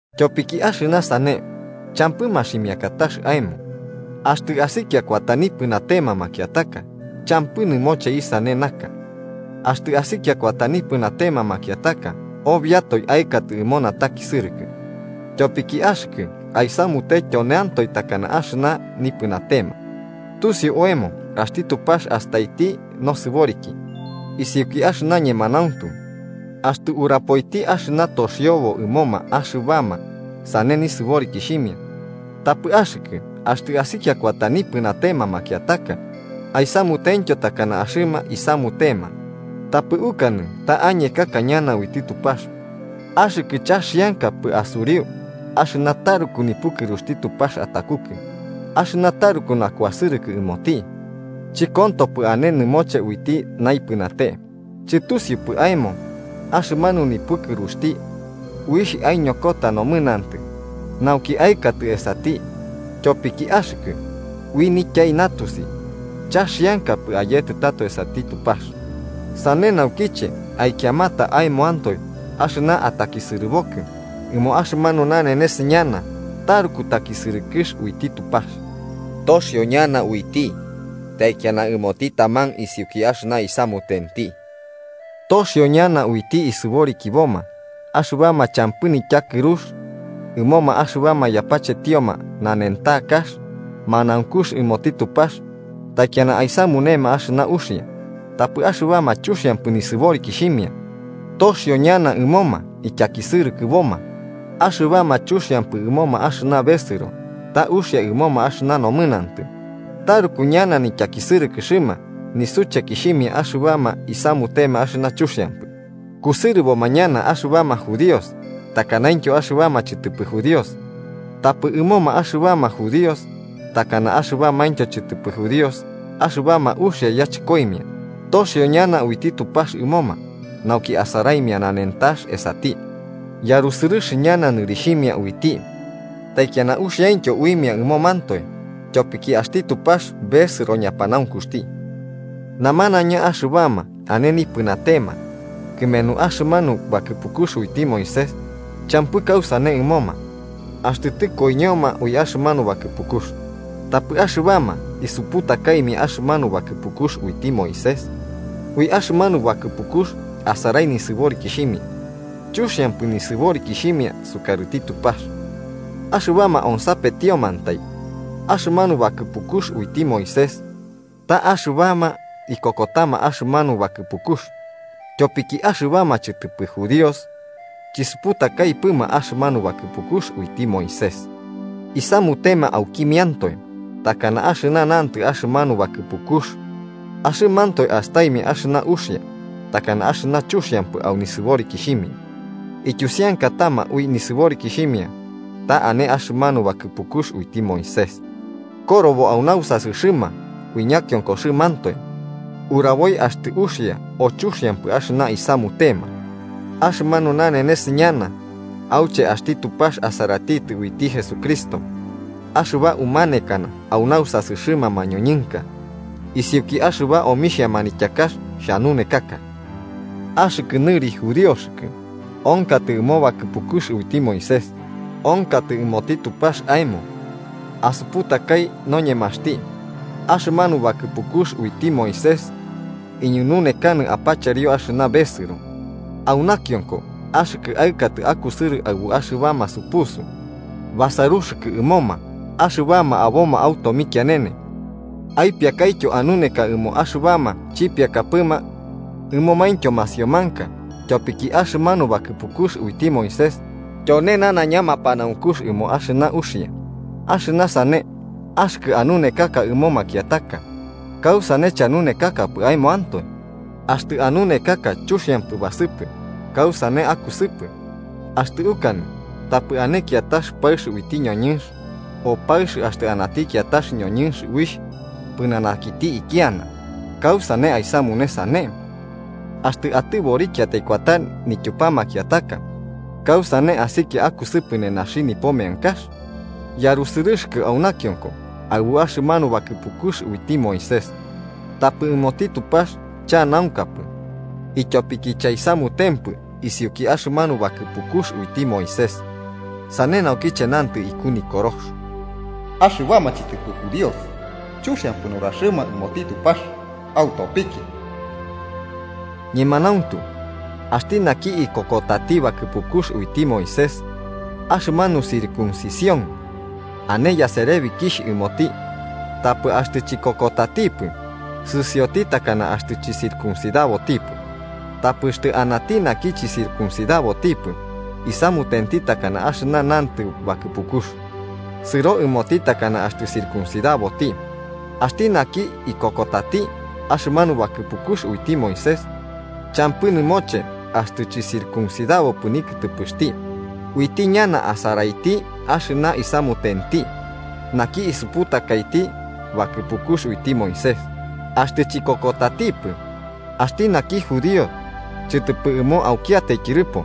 Tyopiki axɨna sane champɨ maximiakatax aemo, axtɨ asikia kuata nipɨnatema makiataka, champɨ nɨmoche isane naka. Axtɨ asikia kuata nipɨnatema makiataka, obiatoe aɨkatɨ ɨmo natakisɨrɨkɨ, tyopiki axɨkɨ aisamute tyoneantoe takana axɨna nipɨnatema. Tusiu oemo axti Tupax astaiti nosɨboriki isiuki axɨna ñemanauntu axtɨ urapoiti axɨna toxiobo ɨmoma axɨbama sane nisɨborikixhimia. Tapɨ axɨkɨ axtɨ, asikia kuata nipɨnatema makiataka, aisamutentyo takana axɨna isamutema, tapɨ ukanɨ ta añekaka ñana uiti Tupax. Axɨkɨ chaxiankapɨ asuriu axɨna taruku nipukɨruxti Tupax atakukɨ, axɨna taruku nakuasɨrɨkɨ ɨmoti, chɨkontopɨ ane nɨmoche uiti naipɨnate. Chɨtusiupɨ aemo, axɨmanu nipukɨruxti uixh aiñokota nomɨnantɨ nauki aɨkatɨ esati. Tyopiki axɨkɨ, ui nityai natusi chaxiankapɨ ayetɨ tato esati Tupax, sane naukiche aikiamata aemoantoe axɨna atakisɨrɨkɨbokɨ ɨmo axɨmanu nanenes ñana taruku takisɨrɨkɨx uiti Tupax toxio ñana uiti taikiana ɨmoti taman isiuki axɨna isamutenti. Toxio ñana uiti isɨborikiboma axɨna champɨ nityakɨrux, ɨmoma axɨbama yapachetioma nanentakax manaunkux ɨmoti Tupax, taikiana aisamunema axɨna uxia. Tapɨ axɨbama chuxiampɨ nisɨborikixhimia, toxio ñana ɨmoma ityakisɨrɨkɨboma, axɨbama chuxiampɨ ɨmoma axɨna besɨro ta uxia ɨmoma axɨna nomɨnantɨ. Taruku ñana nityakisɨrɨkɨxɨma nisuchekixhimia axɨbama isamutema axɨna chuxiampɨ, kusɨrɨboma ñana axɨbama judíos takanaintyo axɨbama chɨtɨpɨ judíos. Tapɨ ɨmoma axɨbama judíos takana axɨbamaintyo chɨtɨpɨ judíos axɨbama uxia yachɨkoimia, toxio ñana uiti Tupax ɨmoma, nauki asaraimia nanentax esati, yarusɨrɨx ñana nɨrixhimia uiti, taikiana uxiaintyo uimia ɨmomantoe. Tyopiki axti Tupax besɨro ñapanaunkuxti. Namanaiña axɨbama ane nipɨnatema kɨmenu axɨmanu bakɨpukux uiti Moisés, champɨ kausane ɨmoma axtɨ tɨkoiñoma ui axɨmanu bakɨpukux. Tapɨ axɨbama isuputakaimia axɨmanu bakɨpukux uiti Moisés, ui axɨmanu bakɨpukux asarai nisɨborikixhimia. Chuxiampɨ nisɨborikixhimia sukarɨti Tupax axɨbama onsapetiomantai axɨmanu bakɨpukux uiti Moisés, ta axɨbama ikokotama axɨmanu bakɨpukux. Tyopiki axɨbama chɨtɨpɨ judíos, chisuputakaipɨma axɨmanu bakɨpukux uiti Moisés, isamutema aukimiantoe takana axɨna nantɨ axɨmanu bakɨpukux, axɨmantoe astaimia axɨna uxia takana axɨna chuxiampɨ au nisɨborikixhimia, ityusiankatama ui nisɨborikixhimia ta ane axɨmanu bakɨpukux uiti Moisés korobo au nausasɨxɨma. Ui ñakiokoxɨmantoe uraboi axtɨ uxia o chuxiampɨ axɨna isamutema au axɨmanu nanenes ñana auche axti Tupax asaratitɨ uiti Jesucristo axɨba umanekana au nausasɨxɨma mañoñɨnka, isiuki axɨba omixhia manityakax xhanunekaka. Axɨkɨ nɨri judíoxɨkɨ, onkatɨ ɨmo bakɨpukux uiti Moisés, onkatɨ ɨmoti Tupax aemo. Asuputakai noñemaxti, axɨmanu bakɨpukux uiti Moisés iñununekanɨ apacherio axɨna besɨro. Au nakionko axɨkɨ aɨkatɨ akusɨrɨ aɨbuma axɨbama supusu, basaruxɨkɨ ɨmoma axɨbama aboma au tomikianene. Aipiakaityo anuneka ɨmoma axɨbama chipiakapɨma, ɨmomaintyo masiomanka, tyopiki axɨmanu bakɨpukux uiti Moisés tyone nanaiña mapanaunkux ɨmo axɨna uxia. Axtɨ sane, axɨkɨ anunekaka ɨmo makiataka, ¿kausane chanunekakapɨ aemoantoe? Axtɨ anunekaka chuxiampɨ basɨpɨ, ¿kausane akusɨpɨ? Axtɨ ukanɨ tapɨ ane kiatax paɨx uiti ñoñɨnx, o paɨx axtɨ anati kiatax ñoñɨnx uixh pɨnanakiti ikiana, ¿kausane aisamune sane? Axtɨ atɨborikiatai kuata nityupa makiataka, ¿kausane asikia akusɨpɨ nenaxi nipo neankaxɨma? Yarusɨrɨxɨkɨ au nakionko aɨbu axɨmanu bakɨpukux uiti Moisés, tapɨ ɨmoti Tupax chanaunkapɨ ityopiki chaisamutempɨ isiuki axɨmanu bakɨpukux uiti Moisés. Sane naukiche nantɨ iku Nikorox: “Axɨbama chɨtɨpɨ judíos chuxiampɨ nuraxɨma ɨmoti Tupax autopiki.” Ñemanauntu, axti naki ikokotati bakɨpukux uiti Moisés, axɨmanu circuncisión ane niyaserebikixh ɨmoti. Tapɨ axtɨ chikokotatipɨ, sɨsioti takana axtɨ chicircuncidabotipɨ. Tapɨ axtɨ anati naki chɨcircuncidabotipɨ, isamutenti takana axɨna nantɨ bakɨpukux, sɨro ɨmoti takana axtɨ circuncidaboti. Axti naki ikokotati axɨmanu bakɨpukux uiti Moisés, champɨ nɨmoche axtɨ chɨcircuncidabopɨ nikɨtɨpɨxti, uiti ñana asaraiti axɨna isamutenti naki isuputakaiti bakɨpukux uiti Moisés, axtɨ chikokotatipɨ. Axti naki judío chɨtɨpɨ ɨmo aukiatai tyɨrɨpo,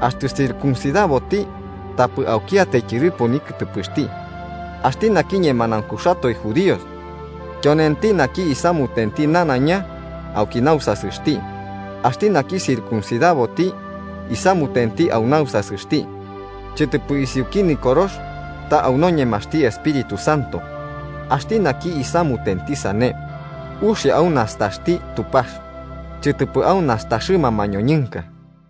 axtɨ circuncidaboti tapɨ aukiatai tyɨrɨpo nikɨtɨpɨxti. Axti naki ñemanaunkuxatoe judío, tyonenti naki isamutenti nanaiña auki nausasɨxti, axti naki circuncidaboti isamutenti au nausasɨxti: chɨtɨpɨ isiuki Nikorox ta ui noñemaxti Espíritu Santo. Axti naki isamutenti sane, uxia au nastaxti Tupax chɨtɨpɨ au nastaxɨma mañoñɨnka.